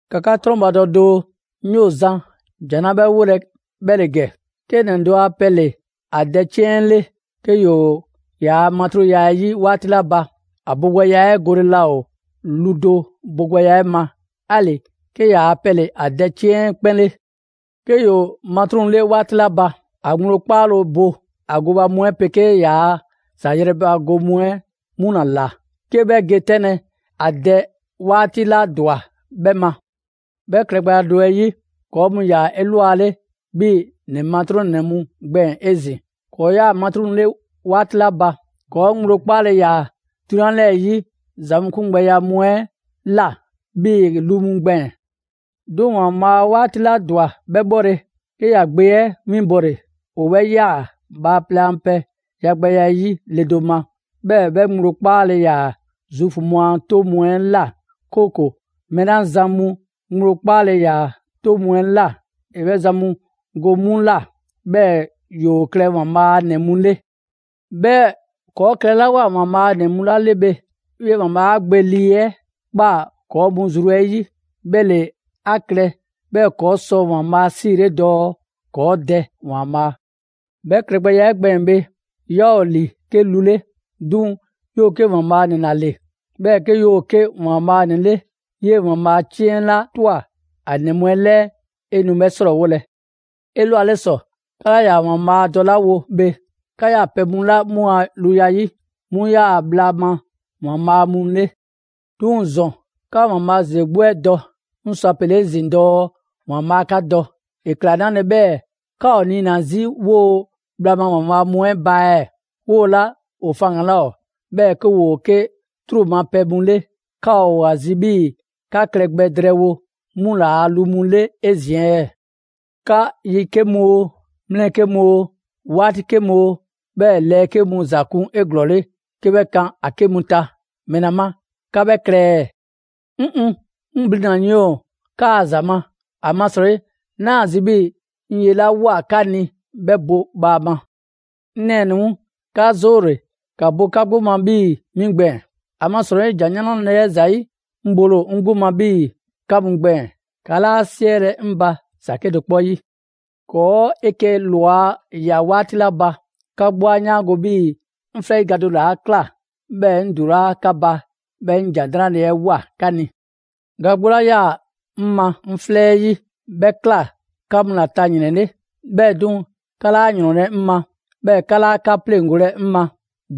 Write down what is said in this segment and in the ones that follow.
‑Ka 'ka 'trɔnbadɔ doo, 'ŋ 'yoo‑ zan ‑jan 'la 'bhɛ 'wolɛ‑ 'bhɛ ‑le ‑gɛ: 'Ke ‑nɛ do a pɛ ‑le ‑a dɛ 'ciɛn 'ɛ 'le; 'ke ‑yoo ‑yaa' matruŋya 'ɛ 'yi 'waati 'la ba, ‑a bogbɛya 'ɛ gole laa ‑o lu do bogbɛya 'ɛ ma, 'ali‑ 'ke ‑yaa' pɛ ‑le ‑a dɛ 'ciɛn 'ɛ 'kpɛn 'le. 'Ke ‑yoo matruŋ 'le 'waati 'la ba, ‑a ŋgblo 'kpaale‑ bo ‑a gooba mu 'ɛ 'pegee ‑yaa' ‑za 'yrɛbago mu 'ɛ 'mu ‑la ꞊la, 'ke 'bhɛ ge 'tɛnlɛ‑ ‑a dɛ 'waati 'la ‑dwa 'bhɛ ma. 'Bhɛ klɛgbɛya do 'ɛ 'yi, ‑kɔɔ' mu ‑yaa 'elwale 'bhii‑ ‑nɛ matruŋnɛ mu gbɛɛn‑ 'ezin‑. ‑Kɔɔ' 'yaa‑ matruŋ 'le 'waati 'la ba, ‑kɔɔ' ŋgblo 'kpaale‑ ‑yaa 'drunyan 'lɛɛ‑ 'yi ‑za mu 'kungbɛya mu 'ɛ ꞊la 'bhii‑ lu mu gbɛɛn‑. 'Duŋ‑ ‑Waanbhaa' 'waati 'la ‑dwa 'bhɛ 'bhɔle‑, 'ke ‑ya Gbe 'ɛ winbɔle. ‑O 'bhɛ ꞊yaa bhaaplɛŋ a pɛ yagbɛya 'ɛ 'yi le do ma, 'bhɛɛ‑ 'bhɛ ŋgblo 'kpaale‑ ‑yaa Zuufu mu a 'toŋ mu 'ɛ ꞊la, 'kooko‑ mɛɛ 'la zan mu ŋgblo 'kpaale‑ ‑yaa 'toŋ mu 'ɛ ꞊la, ‑e 'bhɛ zan mu go 'mu ꞊la, 'bhɛɛ‑ ‑yoo klɛ ‑Waanbhaa' a ‑nɛ mu 'le. 'Bhɛɛ‑ ‑kɔɔ' klɛlawoa ‑Waanbhaa' ‑nɛ mu 'la 'le bhe, 'yee‑ ‑Waanbhaa' 'a Gbe Lii 'Weŋ 'ɛ ꞊kpaa ‑kɔɔ' zru mu 'ɛ 'yi. 'Bhɛ ‑le 'a klɛ 'bhɛɛ‑ ‑kɔɔ' sɔ ‑Waanbhaa' 'siile dɔɔ: «‑Kɔɔ' Dɛ ‑Waanbhaa!» 'Bhɛ klɛgbɛya 'ɛ gbɛɛn‑ bhe, 'yaa ‑o ‑li 'ke lu 'le, 'duŋ‑ 'yoo‑ 'ke ‑Waanbhaa' ‑nɛ ‑la ‑le. 'Bhɛɛ‑ 'ke 'yoo‑ 'ke ‑Waanbhaa' ‑nɛ 'le, 'yee‑ ‑Waanbhaa' 'ciɛn 'la ꞊twa ‑a ‑nɛ mu 'ɛ 'lɛɛ, 'e nu 'bhɛ 'srɔɔwolɛ. 'Elwale ‑sɔ, 'ka 'laa ‑yaa ‑Waanbhaa' dɔlawo bhe, 'ka 'yaa‑ pɛ mu 'la 'mu a luya 'yi, 'mu 'yaa‑ bhla ma ‑waanbhaa' mu 'le. 'Duŋ‑ ‑zɔn, 'ka ‑Waanbhaa' ‑zeze 'gbu 'ɛ dɔ, 'ŋ sɔ a pele‑ 'ezin‑ dɔɔ ‑Waanbhaa' 'ka dɔ, ‑e ꞊kla 'nale‑ 'bhɛɛ‑ 'ka ‑o niina‑ 'zi 'woo‑ bhla ma ‑waanbhaa' mu 'ɛ ba ɛɛ, 'woo‑ 'la ‑o faŋgan‑ 'laa ‑o, 'bhɛɛ‑ 'ke ‑woo 'ke 'truu‑ ma pɛ mu 'le, 'ka ‑o ‑a zi 'bhii‑ 'ka klɛ gbɛ drɛɛwo 'mu ‑laa' lu mu 'le 'ezin‑ ɛɛ? 'Ka yi 'ke mu oo, mlɛ 'ke mu oo, 'waati 'ke mu oo, 'bhɛɛ‑ lɛɛ 'ke mu ‑za kun 'eglɔɔle 'ke 'bhɛ kan ‑a 'ke mu ta. ‑Mɛla ma 'ka 'bhɛ klɛ ɛɛ? 'Ŋŋ! 'Ŋ blina‑ yiɛn ‑o 'kaa‑ ‑za ma, ‑amasrɔyi 'naa‑ zi 'bhii‑ 'ŋ ye 'la ꞊woa 'ka ni 'bhɛ bo bhaama. 'Ŋ nɛɛnɛ‑ mu, 'ka 'zoole‑, ‑ka bo 'ka 'gbu ma, 'bhii‑ 'mi gbɛɛn‑. ‑Amasrɔyi ‑Jan 'Nrale‑ 'ɛ ‑zayi', 'ŋ bole ‑o 'ŋ 'gbu ma 'bhii‑ 'ka mu gbɛɛn‑. 'Ka 'laa 'siɛlɛ‑ 'ŋ ba ‑za 'kedo‑ 'kpɔ 'yi. ‑Kɔɔ' 'eke‑ ꞊lwa ꞊ya 'waati 'la ba, 'ka 'gbu 'a 'yaango‑ 'bhii‑ 'ŋ 'flɛ 'yi ga do ‑le 'a ꞊kla 'bhɛɛ‑ 'ŋ ‑dulaa' 'ka ba, 'bhɛɛ‑ 'ŋ ‑Jan 'Nrale‑ 'ɛ ꞊woa 'ka ni. Ga 'gbu 'la 'yaa‑ 'ŋ ma 'ŋ 'flɛ 'ɛ 'yi, 'bhɛ ꞊kla 'ka mu ta ‑yrɛn 'le. 'Bhɛɛ‑ 'duŋ‑, 'ka 'laa ‑yrɔnlɛ' 'ŋ ma, 'bhɛɛ‑ 'ka 'laa 'ka 'pleŋgolɛ 'ŋ ma.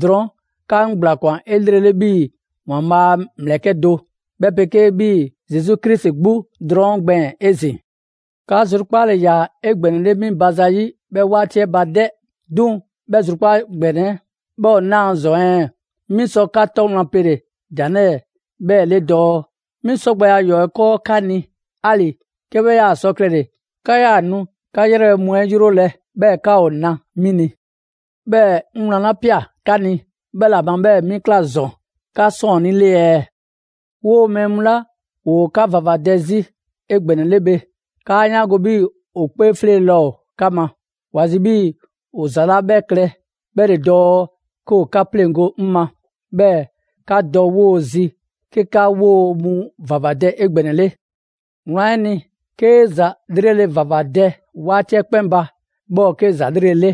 Drɔɔn' 'ka 'ŋ ‑gblakwan 'elrele 'bhii‑ ‑Waanbhaa' a ‑mlɛkɛ' do, 'bhɛ 'pegee‑ 'bhii‑ Zesu Krisi 'gbu drɔɔn' gbɛɛn‑ 'ezin‑. 'Ka zrukpaale 'yaa 'egbɛnɛle 'mi ba zayi' 'bhɛ 'waati 'ɛ ba 'dɛ! 'Duŋ‑, 'bhɛ zrukpaa' ‑gbɛnɛ 'ɛ 'bhɛ ‑o 'naa‑ ‑zɔn ɛɛ? 'Mi sɔ 'ka 'tɔ wlan pele‑ ‑jan 'lɛɛ‑ 'bhɛɛ‑ 'le dɔɔ: 'Mi 'sɔ gbɛ ‑yɔɔ' 'ɛ 'kɔɔ 'ka ni, 'ali‑ 'ke 'bhɛ 'yaa‑ sɔ klɛle‑, 'ka 'yaa‑ nu 'ka 'yrɛbhɛ mu 'ɛ 'yrolɛ‑, 'bhɛɛ‑ 'ka ‑o na 'mi ni. 'Bhɛɛ‑ 'ŋ wlan 'la ꞊pia 'ka ni, 'bhɛ ‑la ma 'bhɛɛ‑ 'mi ꞊kla ‑zɔn 'ka 'sɔɔnnii 'le ɛɛ? 'Woo‑ mɛɛ mu 'la ‑woo 'ka ‑vavadɛ 'zi 'egbɛnɛle bhe, ‑kaa 'yaango‑ 'bhii‑ ‑o 'kpee 'fleele‑ laa ‑o 'ka ma. ‑Wa zi 'bhii‑ ‑o ‑za 'la 'bhɛ klɛ 'bhɛ ‑le dɔɔ 'ke ‑o 'ka 'pleŋgo‑ 'ŋ ma, 'bhɛɛ‑ 'ka dɔ 'woo‑ zi 'ke 'ka 'woo‑ mu ‑vavadɛ 'egbɛnɛle. Wlan 'ɛ ni, 'kee‑ ‑za 'lrele‑ ‑vavadɛ 'waati 'ɛ 'kpɛn ba, 'bhɛ ‑o 'ke ‑za 'lrele‑ 'le.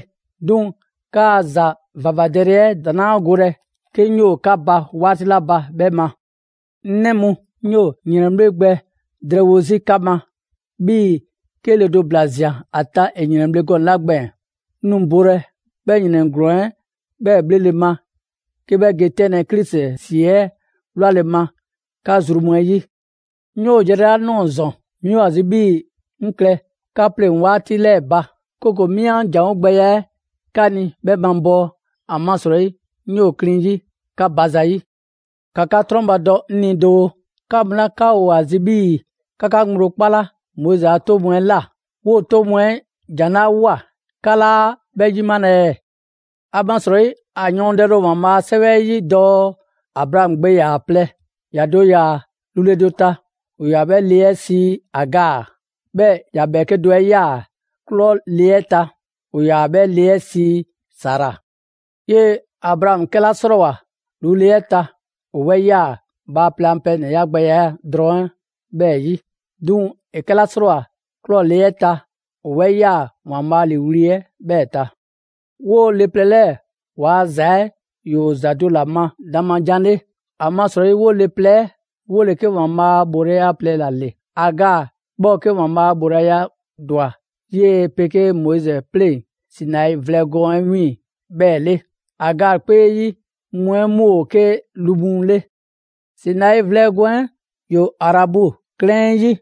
'Duŋ‑ 'kaa‑ ‑za ‑vavadɛle 'ɛ ‑daŋ' 'laa golɛ 'ke 'ŋ 'yoo‑ 'ka ba 'waati 'la ba 'bhɛ ma. 'Ŋ 'nɛ mu, 'ŋ 'yoo‑ ‑yrɛnbhle' gbɛ drɛɛwo 'zi 'ka ma, 'bhii‑ 'ke le do ‑bla ꞊zian ‑a ta ‑e ‑yrɛnbhle' gɔnɛ‑ 'la gbɛɛn‑. 'Ŋ nu bolɛ 'bhɛ ‑yrɛn ‑glɔɔn 'ɛ 'bhɛɛ‑ 'bhlele‑ ma 'ke 'bhɛ ge 'tɛnlɛ‑ Krisi ‑si 'ɛ 'wlale‑ ma 'ka zru mu 'ɛ 'yi. 'Ŋ 'yoo yrɛ 'la ꞊nɔɔ ‑zɔn, 'mi ‑o ‑a zi 'bhii‑ 'ŋ klɛ 'ka 'pleŋ‑ 'waati 'lɛɛ‑ ba, 'kooko‑ 'mi 'an ‑janwo' gbɛya 'ɛ 'ka ni 'bhɛ mabɔɔ. ‑Amasrɔyi 'ŋ 'yoo‑ klin 'yi 'ka ba zayi'. ‑Ka 'ka 'trɔnbadɔ 'ŋ ni doo: 'Ka mu 'la 'ka ‑o ‑a zi' 'bhii‑ 'ka 'ka ŋgblo 'kpala Moizi a 'toŋ mu 'ɛ ꞊la, 'woo‑ 'toŋ mu 'ɛ ‑jan 'la ꞊woa 'ka 'laa 'bhɛ 'yimalɛ ɛɛ? ‑Amasrɔyi ‑a yɔɔndɛle ‑o ‑Waanbhaa' a 'Sɛwɛ 'ɛ 'yi dɔɔ Abraamu gbe ‑yaa plɛ. ‑Ya do ‑yaa lu le do ta, ‑o ‑yaa 'bhɛ le 'ɛ sii Agaa. 'Bhɛɛ‑ ‑ya ‑bhɛɛke' do 'ɛ 'yaa‑ ꞊klɔ le 'ɛ ta, ‑o ‑yaa 'bhɛ le 'ɛ sii Sara. 'Yee‑ Abraamu 'kɛla 'srɔɔwoa‑ lu le 'ɛ ta, ‑o 'bhɛ ꞊yaa bhaaplɛŋ a pɛ ‑nɛya' gbɛya drɔŋ 'ɛ 'bhɛɛ‑ 'yi. 'Duŋ‑ ‑e 'kɛla 'srɔɔwoa‑ ꞊klɔ‑ le 'ɛ ta, ‑o 'bhɛ ꞊yaa ‑Waanbhaa' ‑liiwli' 'ɛ 'bhɛɛ‑ ta. 'Woo le plɛ 'lɛɛ‑ waa ‑za 'ɛ ‑yoo ‑za do ‑la ma dan ma jan 'le. ‑Amasrɔyi 'woo‑ le plɛ 'ɛ ‑woo 'ke ‑Waanbhaa' a ‑bhoolaya plɛ ‑la ‑le. Agaa 'bhɛ ‑o 'ke 'yee‑ ‑Waanbhaa' ‑bhoolaya 'la ‑dwa 'yee‑ 'pegee Moizi 'pleŋ‑ Sinai vlɛ gɔɔn 'ɛ 'wiiŋ‑ 'bhɛɛ‑ 'le. Agaa 'kpee yi mu 'ɛ 'mu ‑o 'ke lu mu 'le. Sinai vlɛ gɔɔn 'ɛ ‑yoo Arabu 'klɛɛn 'ɛ 'yi;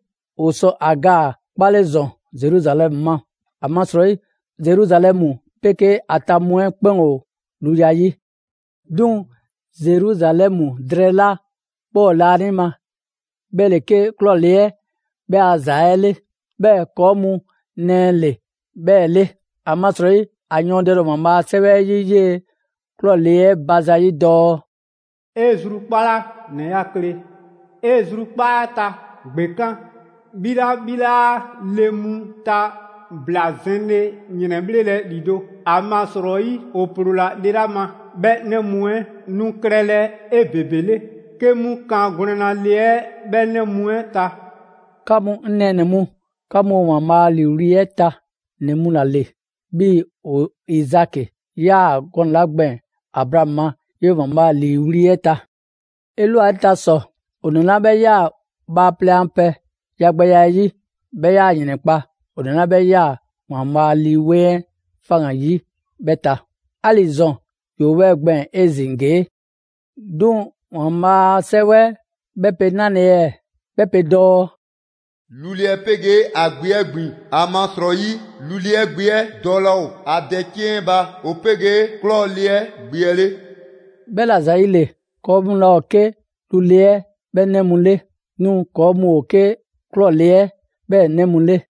‑o sɔ Agaa 'kpale ‑zɔn Zeruzalɛmu ma. ‑Amasrɔyi Zeruzalɛmu 'pegee ‑a ta mu 'ɛ 'kpɛn ‑o luya 'yi. 'Duŋ‑ Zeruzalɛmu drɛɛ 'la 'bhɛ ‑o laanima, 'bhɛ ‑le 'ke ꞊klɔ le 'ɛ 'bhɛɛ‑ a ‑za 'ɛ 'le. 'Bhɛɛ‑ ‑kɔɔ' mu nɛɛ 'le 'bhɛɛ‑ 'le. ‑Amasrɔyi ‑a yɔɔndɛle ‑o ‑Waanbhaa' a 'Sɛwɛ 'ɛ 'yi 'yee‑ ꞊klɔ le 'ɛ ba zayi' dɔɔ: «'E zrukpala, ‑nɛ 'ya kle! 'E zrukpaa' 'ɛ ta ‑gbekan', 'bhi 'la 'bhi 'laa le mu ta ‑bla zɛnle ‑yrɛnbhlelɛ ‑lido'! ‑Amasrɔyi ‑o ‑ploola le 'la ma, 'bhɛ 'nɛ mu 'ɛ nu klɛlɛ 'ebebele 'ke 'mu kan gwlɛnna le 'ɛ 'bhɛ 'nɛ mu 'ɛ ta.» 'Ka mu 'ŋ nɛɛnɛ‑ mu, 'ka mu ‑o ‑Waanbhaa' a ‑liiwli' 'ɛ ta ‑nɛ mu ‑la ‑le, 'bhii‑ ‑o Izaki ꞊yaa gɔnɛ‑ 'la gbɛɛn‑ Abraamu ma 'yee‑ ‑Waanbhaa' ‑liiwli' 'ɛ ta. 'Elwale ta ‑sɔ, ‑o ‑nɛ 'la 'bhɛ ꞊yaa bhaaplɛŋ a pɛ yagbɛya 'ɛ 'yi, 'bhɛ 'yaa‑ ‑yrɛnkpa' ‑o ‑nɛ 'la 'bhɛ ꞊yaa ‑Waanbhaa' Lii 'Weŋ 'ɛ faŋgan‑ 'yi 'bhɛ ta. 'Ali‑ ‑zɔn ‑yoo 'bhɛɛ‑ gbɛɛn‑ 'ezin‑ ‑gee'. 'Duŋ‑ ‑Waanbhaa' a 'Sɛwɛ 'ɛ 'bhɛ pe 'nale‑ ɛɛ? 'Bhɛ pe dɔɔ: «Lu le 'ɛ 'pegee ‑a gbe 'ɛ ‑gbin. ‑Amasrɔyi lu le 'ɛ gbe 'ɛ dɔ laa ‑o ‑a dɛ 'ciɛn 'ɛ ba ‑o 'pegee ꞊klɔ le 'ɛ gbe 'ɛ 'le.» 'Bhɛla‑ ‑zayile, ‑kɔɔ' mu laa ‑o 'ke lu le 'ɛ 'bhɛ 'nɛ mu 'le, 'duŋ‑ ‑kɔɔ' mu ‑o 'ke ꞊klɔ le 'ɛ 'bhɛɛ‑ 'nɛ mu 'le.